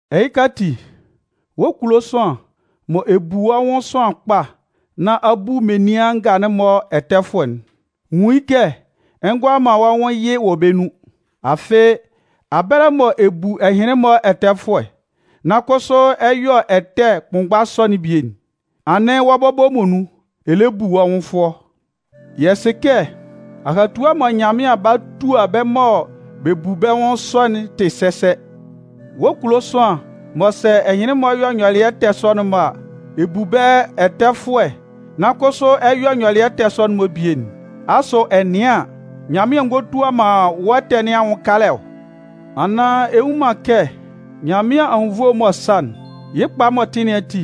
Ɛhɩka ati, wɔ́ kulo sʋanlan, mɔ ɛ bu wɔ́ nwʋn sʋanlan kpa nán a bu menian nga'n-mɔ ɛtɛfʋɛ'n, nwun yɩ́ kɛ ɛ ngʋala man wɔ́ nwʋn yɩ wɔ bɛ́ nun. Afɩ, abɛlɛ mɔ ɛ bu ɛhɩnlɩn-mɔ ɛtɛfʋɛ, nan kʋsʋ ɛ yɔ ɛtɛ kʋnmgba sɔ'n bie'n, anɩn wɔ́ bɔbɔ muonun, ɛ lɛ bu wɔ́ nwʋn fʋɔ. Yɛ sɩ kɛ, ahatua mɔ Nyanmɩan 'ba tua bɛ́ mɔ bɛ bu bɛ́ nwʋn sɔ'n tɩ sɛsɛ. Wɔ́ kulo sʋanlan, mɔ sɛ ɛhɩnlɩn-mɔ yɔ nyɔlɩɛ ɛtɛ sɔ'n-mɔ a, ɛ bu bɛ́ ɛtɛfʋɛ nan kʋsʋ ɛ yɔ nyɔlɩɛ ɛtɛ sɔ'n-mɔ bie'n, asʋ ɛ nɩan an, Nyanmɩan ngɔ tua man wɔ́ ɛtɛ nɩn anwʋn kalɛ ɔ? Anaan ɛ nnwun man kɛ Nyanmɩan anwunnvoe m'ɔ sa'n, yɩ́ kpa m'ɔ tɩ nɩn ati,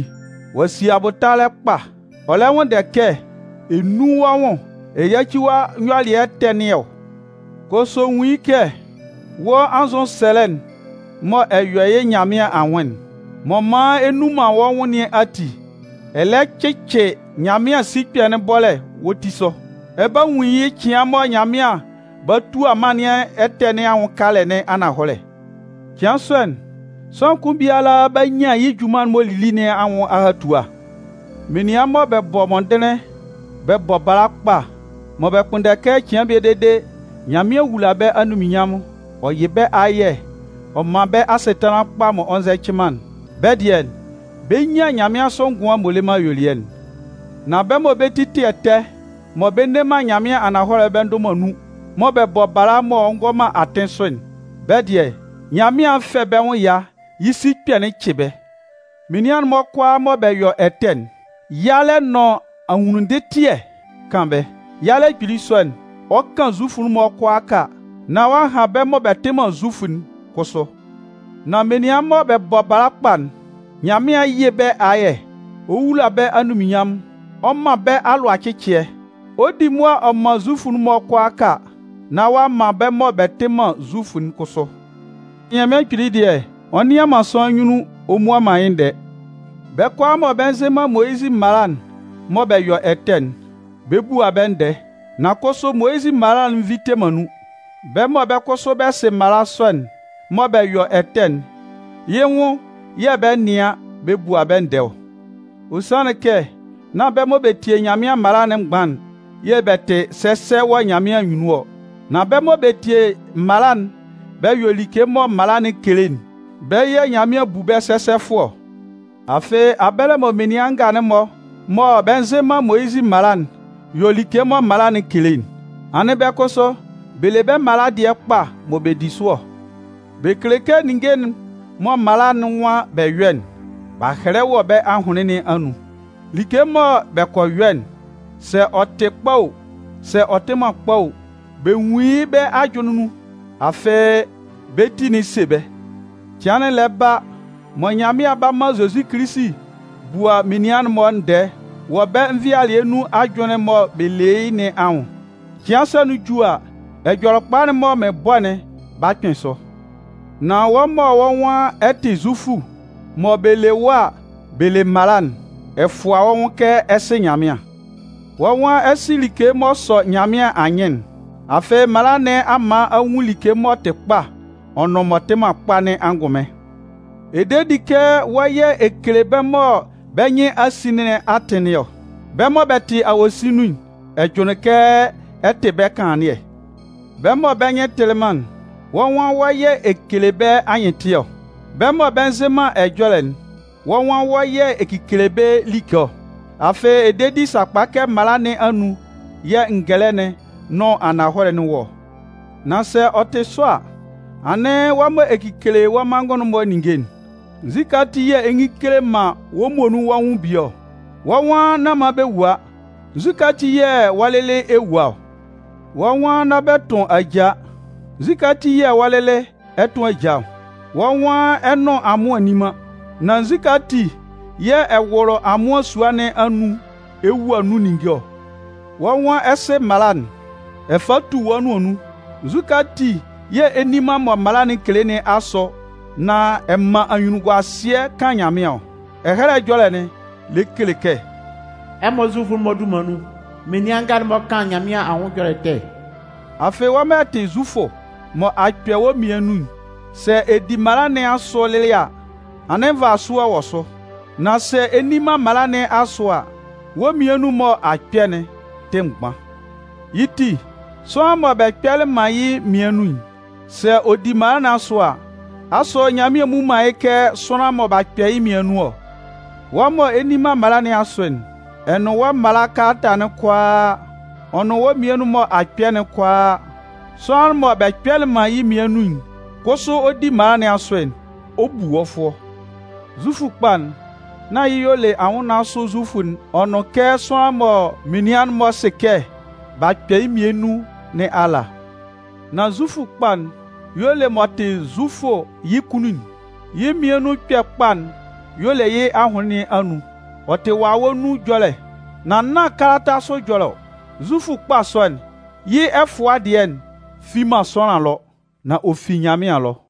ɔ'a si abʋtalɛ kpa, ɔ lɛ nwʋnndɛ kɛ ɛ nún wɔ́ nwʋn ɛ yáci wɔ́ nyɔlɩɛ ɛtɛ nɩn ɔ? Kʋsʋ nwun yɩ́ kɛ wɔ́ anzʋsɛlɛ'n mɔ ɛ yɔ yɩ́ Nyanmɩan anwʋn'n, m'ɔ man ɛ nnun man wɔ́ nwʋn nɩn ati, ɛ lɛ cɩcɩ Nyanmɩan sikpɛ'n bɔ́lɛ wɔ́ ti sʋ. Ɛ 'ba nwun yɩ́ cɩan mɔ Nyanmɩan 'ba tua mân nɩn ɛtɛ nɩn anwʋn kalɛ ananhɔlɛ. Cɩan sɔ'n, sʋanlan kʋn biala 'ba nyan yɩ́ junman'n m'ɔ lili nɩn anwʋn ahatua. Menian mɔ bɛ bɔ mɔndɩnlɩn bɛ bɔ bala kpa, mɔ bɛ kpʋnndɛ kɛ cɩan bie dede, Nyanmɩan wúla bɛ́ anunminnyanmʋn, ɔ yɩ́ bɛ́ ayɛ ɔ mán bɛ́ asɩtanlan kpa m'ɔ nzɛcɩ man'n, bɛ́ dɩɛ, bɛ 'nyan nyanmɩansʋ ngʋan m'ɔ le man ayuelɩɛ'n. Nan bɛ́ mɔ bɛ́ ti tɩ ɛtɛ, mɔ bɛ nne man ananhɔlɛ'n bɛ ndʋ man nun, mɔ bɛ bɔ bala m'ɔ ngɔ atɩn sʋ'n, bɛ́ dɩɛ, Nyanmɩan 'fɛ bɛ́ nwʋn ɛya, yɩ́ sikpɛ'n 'cɩ bɛ́. Menian'n-mɔ kʋalaa mɔ bɛ yɔ ɛtɛ'n, yalɛ nʋn ahunnunndɩtɩɛ 'kan bɛ́. Yalɛ kpili sɔ'n, ɔ 'kan Zufʋ'n-mɔ kʋalaaka, nán ɔ'a han bɛ́ mɔ bɛ tɩ man Zufʋ'n kʋsʋ. Nan menian mɔ bɛ bɔ bala kpa'n, Nyanmɩan 'yɩ bɛ́ ayɛ, ɔ 'wula bɛ́ anunminnyanmʋn, ɔ 'man bɛ́ alʋacɩcɩɛ. Ɔ 'di mʋa ɔ man Zufʋ'n-mɔ kʋalaaka nán ɔ'a man bɛ́ mɔ bɛ tɩ man Zufʋ'n kʋsʋ. Nyanmɩan Kpili dɩɛ, ɔ nnɩan man sʋanlan nyunnun ɔ mmua man yɩ́ ndɛɛ. Bɛ́ kʋalaa mɔ bɛ nzɩ man Moyizɩ mala'n mɔ bɛ yɔ ɛtɛ'n, bɛ 'bua bɛ́ ndɛɛ, nan kʋsʋ Moyizɩ mala'n nvite man nun. Bɛ́ mɔ bɛ́ kʋsʋ bɛ sɩ mala sɔ'n, mɔ bɛ yɔ ɛtɛ'n, yɩ́ nwʋn yɛ̂ bɛ 'nɩan bɛ bua bɛ́ ndɛɛ ɔ. Ɔ sanlɩn kɛ nán bɛ́ mɔ bɛ tie Nyanmɩan mala'n mgban'n yɛ̂ bɛ tɩ sɛsɛ wɔ Nyanmɩan anyunnun ɔ, nan bɛ́ mɔ bɛ tie mala'n bɛ yɔ like mɔ mala'n kele'n, bɛ́ yɛ̂ Nyanmɩan bu bɛ́ sɛsɛfʋɛ ɔ. Afɩ, abɛlɛ mɔ menian nga'n-mɔ mɔ bɛ nzɩ man Moyizɩ mala'n yɔ like mɔ mala'n kele'n, anɩn bɛ kʋsʋ, bɛ le bɛ́ mala dɩɛ kpa mɔ bɛ di sʋ ɔ. Bɛ kele kɛ ninnge'n mɔ mala'n nwan bɛ yɔ́'n, b'a hɛlɛ wɔ bɛ́ ahʋnlɩn nɩn anun. Like mɔ bɛ kɔ yɔ'n, sɛ ɔ tɩ kpa o, sɛ ɔ tɩ man kpa o, bɛ nwun yɩ́ bɛ́ ajʋnlɩn nun. Afɩ, bɛ́ ti'n se bɛ́. Cɩan'n lɛ ba mɔ Nyanmɩan 'ba man Zozi Kilisi bua menian'n-mɔ ndɛɛ wɔ bɛ́ nvɩalɩɛ nun ajʋnlɩn'n mɔ bɛ le yɩ́ nɩn anwʋn. Cɩan sɔ'n ju a, Ɛjɔlɛkpa'n mɔ mɩn bɔ'n 'ba kpɩn sʋ. Nan wɔ́ mɔ wɔ́ nwan ɛ tɩ Zufʋ mɔ bɛ le wɔ́ a, bɛ le mala'n, ɛ fʋa wɔ́ nwʋn kɛ ɛ sɩ Nyanmɩan. Wɔ́ nwan ɛ sɩ like m'ɔ sɔ Nyanmɩan anyɩn'n, afɩ mala nɩn a man a nwun like m'ɔ tɩ kpa ɔ nʋn m'ɔ tɩ man kpa nɩn angʋnmɩn. Ɛ de di kɛ wɔ́ yɛ̂ ɛ kele bɛ́ mɔ bɛ́ nyɩn a sin nɩn atɩn nɩn ɔ. Bɛ́ mɔ bɛ tɩ awosin nun'n, ɛ jʋnlɩn kɛ ɛ tɩ bɛ́ kanlannɩɛ. Bɛ́ mɔ bɛ́ nyɩn tɩlɩ man'n, wɔ́ nwan wɔ́ yɛ̂ ɛ kele bɛ́ anyɩntɩɛ ɔ. Bɛ́ mɔ bɛ nzɩ man ɛjɔlɛ'n, wɔ́ nwan wɔ́ yɛ̂ ɛ kekele bɛ́ like ɔ. Afɩ ɛ de di sakpa kɛ mala nɩn anun yɛ̂ ngɛlɛ'n nʋn ananhɔlɛ'n wɔ ɔ. Nan sɛ ɔ tɩ sɔ a, anɩn, wɔ́ mɔ ɛ kekele wɔ́ manngʋn'n-mɔ ninnge'n, nzukɛ ati yɛ̂ ɛ ngele man wɔ́ muonun wɔ́ nwʋn bie ɔ? Wɔ́ nwan nán man bɛ wua, nzukɛ ati yɛ̂ wɔ́ lɩlɩ, ɛ wua ɔ? Wɔ́ nwan nán man bɛ tʋn ajaa, nzukɛ ati yɛ̂ wɔ́ lɩlɩ, ɛ tʋn ajaa ɔ? Wɔ́ nwan ɛ nʋn amʋan nni man, nan nzukɛ ati yɛ̂ ɛ wʋlʋ amʋan sua nɩn anun ɛ wua nun ninnge ɔ? Wɔ́ nwan ɛ sɩ mala'n, ɛ fa tu wɔ́ nʋan nun, nzukɛ ati yɛ̂ ɛ nni man mɔ mala'n kele nɩn asʋ nan ɛ man anyunnunguasɩɛ kan Nyanmɩan ɔ? Ɛhɛlɛ Ɛjɔlɛ'n lɛ kele kɛ: “Ɛmɔ Zufʋ'n-mɔ dunman nun, menian nga'n-mɔ kan Nyanmɩan anwʋn ɛjɔlɛ ɛtɛ.” Afɩ wɔ́ mɔ ɛ tɩ Zufʋ, mɔ a kpɛ wɔ́ mmian nun'n, sɛ ɛ di mala nɩn asʋ lɩlɩ a, anɩn nvasʋɛ wɔ sʋ. Nan sɛ ɛ nni man mala nɩn asʋ a, wɔ́ mmian nun'n mɔ a kpɛ'n tɩ mgban. Yɩ́ ti, sʋanlan mɔ bɛ kpɛlɩ man yɩ́ mmian nun'n, sɛ ɔ di mala nɩn asʋ a, asʋ Nyanmɩan mmu man yɩ́ kɛ sʋanlan mɔ b'a kpɛ yɩ́ mmian nun ɔ? Wɔ́ mɔ ɛ nni man mala nɩn asʋ'n, ɛ nʋn wɔ́ mala kalata'n kʋalaa, ɔ nʋn wɔ́ mmian nun mɔ a kpɛ'n kʋalaa, sʋanlan mɔ bɛ kpɛlɩ man yɩ́ mmian nun kʋsʋ ɔ di mala nɩn asʋ'n, ɔ 'bu wɔ́ fʋɔ. Zufʋ kpa'n nán y'ɩ y'ɔ le anwʋnnaan sʋ Zufʋ'n ɔ nʋn kɛ sʋanlan mɔ menian'n-mɔ sɩ kɛ b'a kpɛ yɩ́ mmian nun nɩn ala. Nan Zufʋ kpa'n y'ɔ le m'ɔ tɩ Zufʋ yɩ́ kunnun'n. Yɩ́ mmian nun ɛkpɛ kpa'n y'ɔ le yɩ́ ahʋnlɩn nɩn anun. Ɔ tɩ Wawɛ nun ɛjɔlɛ, nan nán kalata sʋ ɛjɔlɛ ɔ. Zufʋ kpa sɔ'n, yɩ́ ɛfʋa dɩɛ'n fi man sʋanlan ɛlɔ, nan ɔ fi Nyanmɩan ɛlɔ.